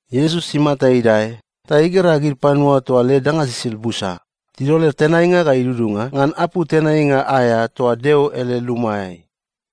Iesus imata idae ta igera gid panua toa led danga sisid busa tidol led tenainga ga idudunga ngan apou tenainga aea toa Deo ele lumaeai.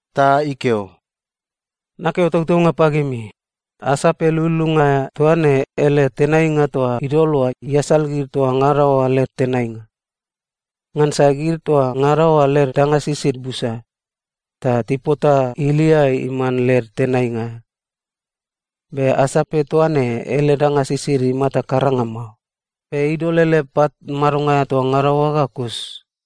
Ta ikeo, “Nakeo tautaunga pagimi, asape lululunga aea toa ne ele tenainga toa idol oa iasal gid toa ngada oa led tenainga. Ngansa gid toa ngada oa led danga sisid busa, ta tipota ilia iman led tenainga. Be asape toa ne ele danga sisid imata karanga mao, be idol ele pat madonga aea toa ngada oa ga kus.”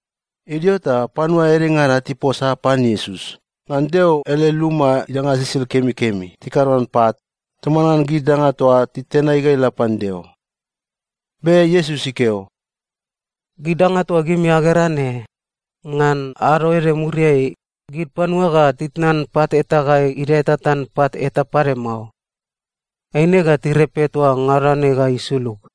Idio ta panua edengada tiposa pan Iesus ngan Deo ele luma idanga sisid kemikemi tikado ngan pat toman ngan gid danga toa panua titenai ga ila pan Deo. Be Iesus ikeo, “Gid danga toa gimi agera ne, ngan ado ede muriai, gid panua ga titnan pat eta ga idae tatan pat eta pade mao. Eine ga tirepe toa ngada ne ga isulug.”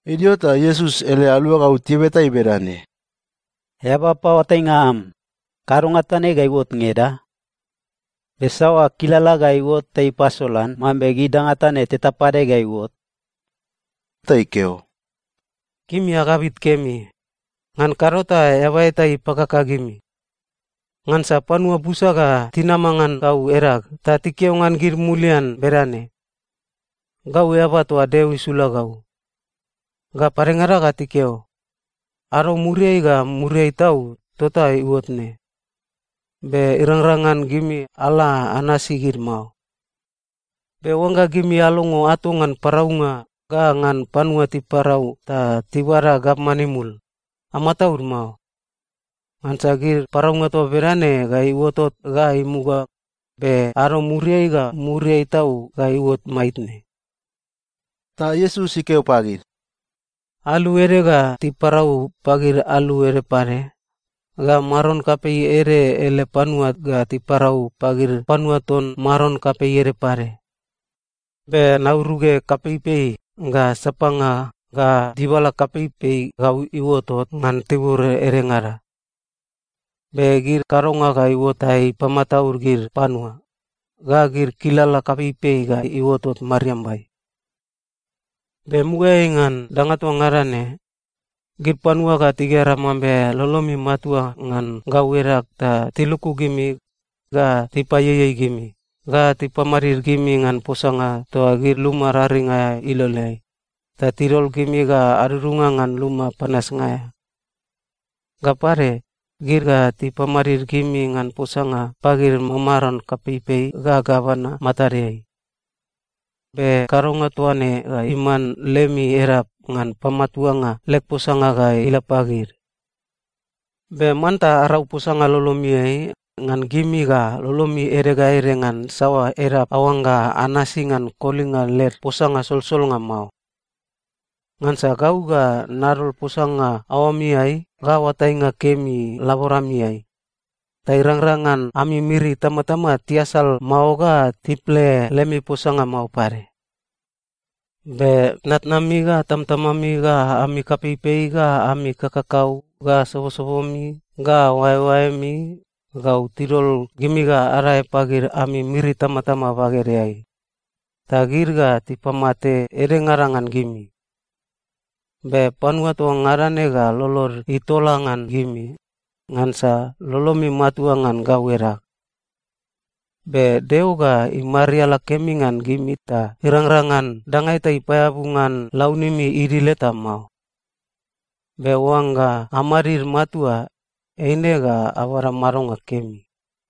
Idio ta Iesus ele aluagau tibeta ei bedane, “Eaba paoatainga am, kadonga toa ne ga iuot ngeda? Be saoa kilala ga iuot ta ipasolan mambe gid danga toa ne teta pade ga iuot?” Ta ikeo, “Gimi agabit kemi. Ngan kado ta eaba eta ipakaka gimi. Ngansa panua busa ga tinama ngan gau edag ta tikeo ngan gid mulian bedane, ‘Gau eaba toa Deo isula gau.’ Ga padengada ga tikeo, ‘Ado muriai ga muriai tau tota iuot ne.’ Be irangrang ngan gimi ala anasi gid mao. Be oangga gimi alongo ato ngan paraunga ga ngan panua tiparau ta tibada gavman imul, amataud mao. Ngansa gid paraunga toa bedane ga iuotot ga imuga, be ado muriai ga muriai tau ga iuot maitne.” Ta Iesus ikeo pagid, “Alu ede ga tiparau pagid alu ede pade, ga maron kapei ede ele panua ga tiparau pagid panua ton maron kapei ede pade. Be nauruge kapeipei, ga sapanga, ga dibala kapeipei gau iuotot ngan tibur edengada. Be gid kadonga ga iuot ta ipamataud gid panua, ga gid kilala kapeipei ga iuotot mariambai. “Be mugaeai ngan danga toa ngada ne, gid panua ga tigera mambe lolomi matua ngan gau edag ta tiluku gimi, ga tipaieiei gimi, ga tipamadid gimi ngan posanga toa gid luma raring aea iloleai, ta tidol gimi ga adudunga ngan luma panasnga aea. Ga pade, gid ga tipamadid gimi ngan posanga pagid mamaron kapeipei ga gavana matadeai. Be kadonga toa ne ga iman lemi edap ngan pamatuanga leg posanga ga ila pagid. Be manta arau posanga lolomiai, ngan gimi ga lolomi ede ga ede ngan saoa edap aoangga anasi ngan kolinga led posanga solsolnga mao. Ngansa gau ga nadol posanga aoamiai ga oatainga kemi laboramiai, ta irangrang ngan ami miri itamatama tiasal mao ga tiple lemi posanga mao pade. Be tnatnami ga tamtamami ga ami kapeipei ga ami kakakau ga sobosobomi ga oaeoaemi gau tidol gimi ga adae pagid ami miri itamatama bagedeai, ta gid ga tipamate edengada ngan gimi. Be panua toa ngada ne ga lolod itola ngan gimi, ngansa lolomi matua ngan gau edag. Be Deo ga imariala kemi ngan gimi ta irangrang ngan danga eta ipaeabu ngan launimi idil eta mao. Be oangga amadid matua, eine ga abada madonga kemi.”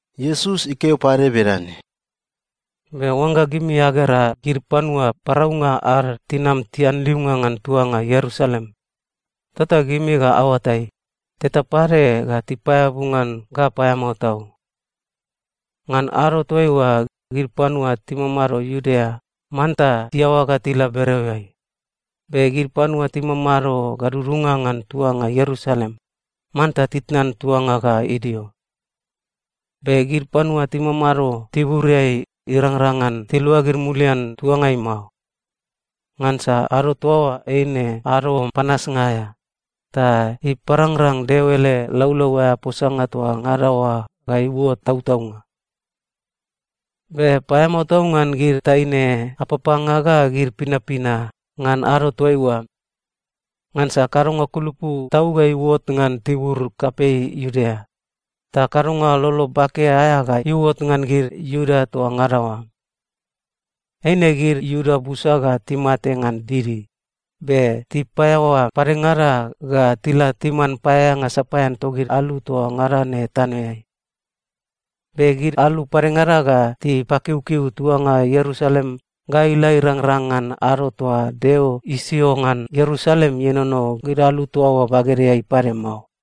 Iesus ikeo pade bedane, “Be oangga gimi agera gid panua paraunga ad tinam tianliunga ngan tuanga Ierusalem, tota gimi ga aoatai, teta pade ga tipaeabu ngan ga paeamao tau. Ngan ado toaiua, gid panua timamado Iudea manta tiaoa ga tila bereoeai, be gid panua timamado gadudunga ngan tuanga Ierusalem manta titnan tuanga ga idio, be gid panua timamado tiburiai irangrang ngan tiluagid mulian tuangai mao. Ngansa ado toa oa eine ado panasnga aea, ta iparangrang Deo ele laulau aea posanga toa ngada oa ga iuot tautaunga. Be paeamao tau ngan gid taine apapanga ga gid pinapina ngan ado toaiua. Ngansa kadonga kulupu tau ga iuot ngan tibur kapei Iudea, ta kadonga lolo bake aea ga iuot ngan gid Iuda toa ngada oa. Eine gid Iuda busa ga timate ngan didi, be tipaeaoa padengada ga tila timan paeaeanga sapaean togid alu toa ngada ne tanoeai. Be gid alu padengada ga tipakiukiu tuanga Ierusalem ga ila irangrang ngan ado toa Deo isio ngan Ierusalem ienono gid alu toa oa bagedeai pade mao.”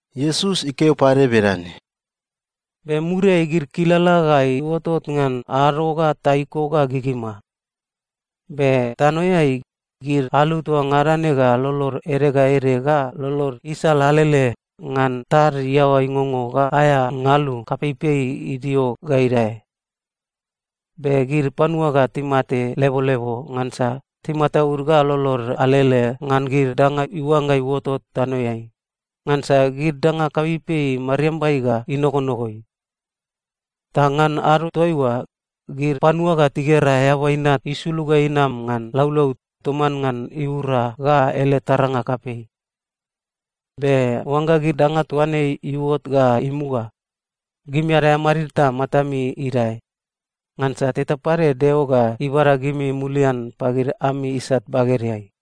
Iesus ikeo pade bedane, “Be muriai gid kilala ga iuotot ngan ado ga taiko ga gigima. Be tanoeai, gid alu toa ngada ne ga lolod ede ga ede ga lolod isal alele ngan tad iaoa ingongo ga aea ngalu kapeipei idio ga idae. Be gid panua ga timate lebolebo ngansa timataud ga lolod alele ngan gid danga iuangga iuotot tanoeai, ngansa gid danga kapeipei mariambai ga inogonogoi. Ta ngan ado toaiua, gid panua ga tigera Eaba Inat isulug ga inam ngan laulau toman ngan iura ga ele taranga kapei. Be oangga gid danga toa ne iuot ga imuga, gimi adae amadid ta matami idae, ngansa teta pade Deo ga ibada gimi mulian pagid ami isat bagedeai.”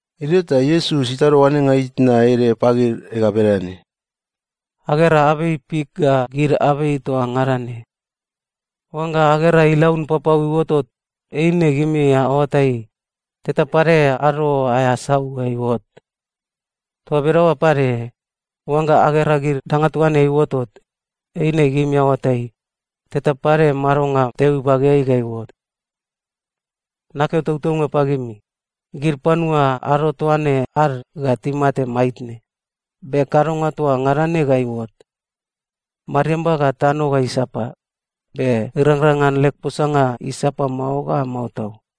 Idio ta Iesus itado oanenga itna ede pagid ga bedane, “Agera abei fik ga gid abei toa ngada ne. Oangga agera ilaun papau iuotot, eine gimi aoatai, teta pade ado aea sau ga iuot. Toa bedaoa pade, oangga agera gid danga toa ne iuotot, eine gimi aoatai, teta pade madonga Deo ibageai ga iuot. “Nakeo tautaunga pagimi, gid panua ado toa ne ad ga timate maitne, be kadonga toa ngada ne ga iuot. Mariamba ga tano ga isapa, be irangrang ngan leg posanga isapa mao ga mao tau.”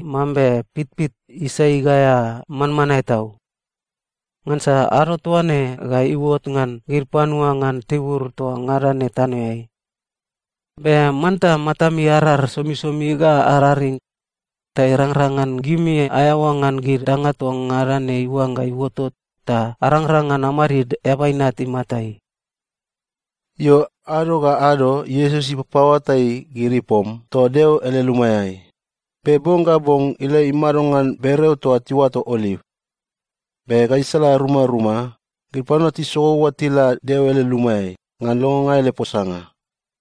mambe pitpit isai gaea manmanae tau. Ngansa ado toa ne ga iuot ngan gid panua ngan tibur toa ngada ne tanoeai. Be manta matami arar somisomi ga araring, ta irangrang ngan gimi aeaoa ngan gid danga toa ngada ne iuangga iuotot ta arangrang ngan amadid Eaba Inat imatai.” Io, ado ga ado Iesus ipapaoatai gid ipom toa Deo ele lumaeai, be bong ga bong ila imado ngan bereo toa tiuato Oliv. Be gaisala rumaruma, gid panua tisogou ga tila Deo ele lumaeai ngan longonga ele posanga.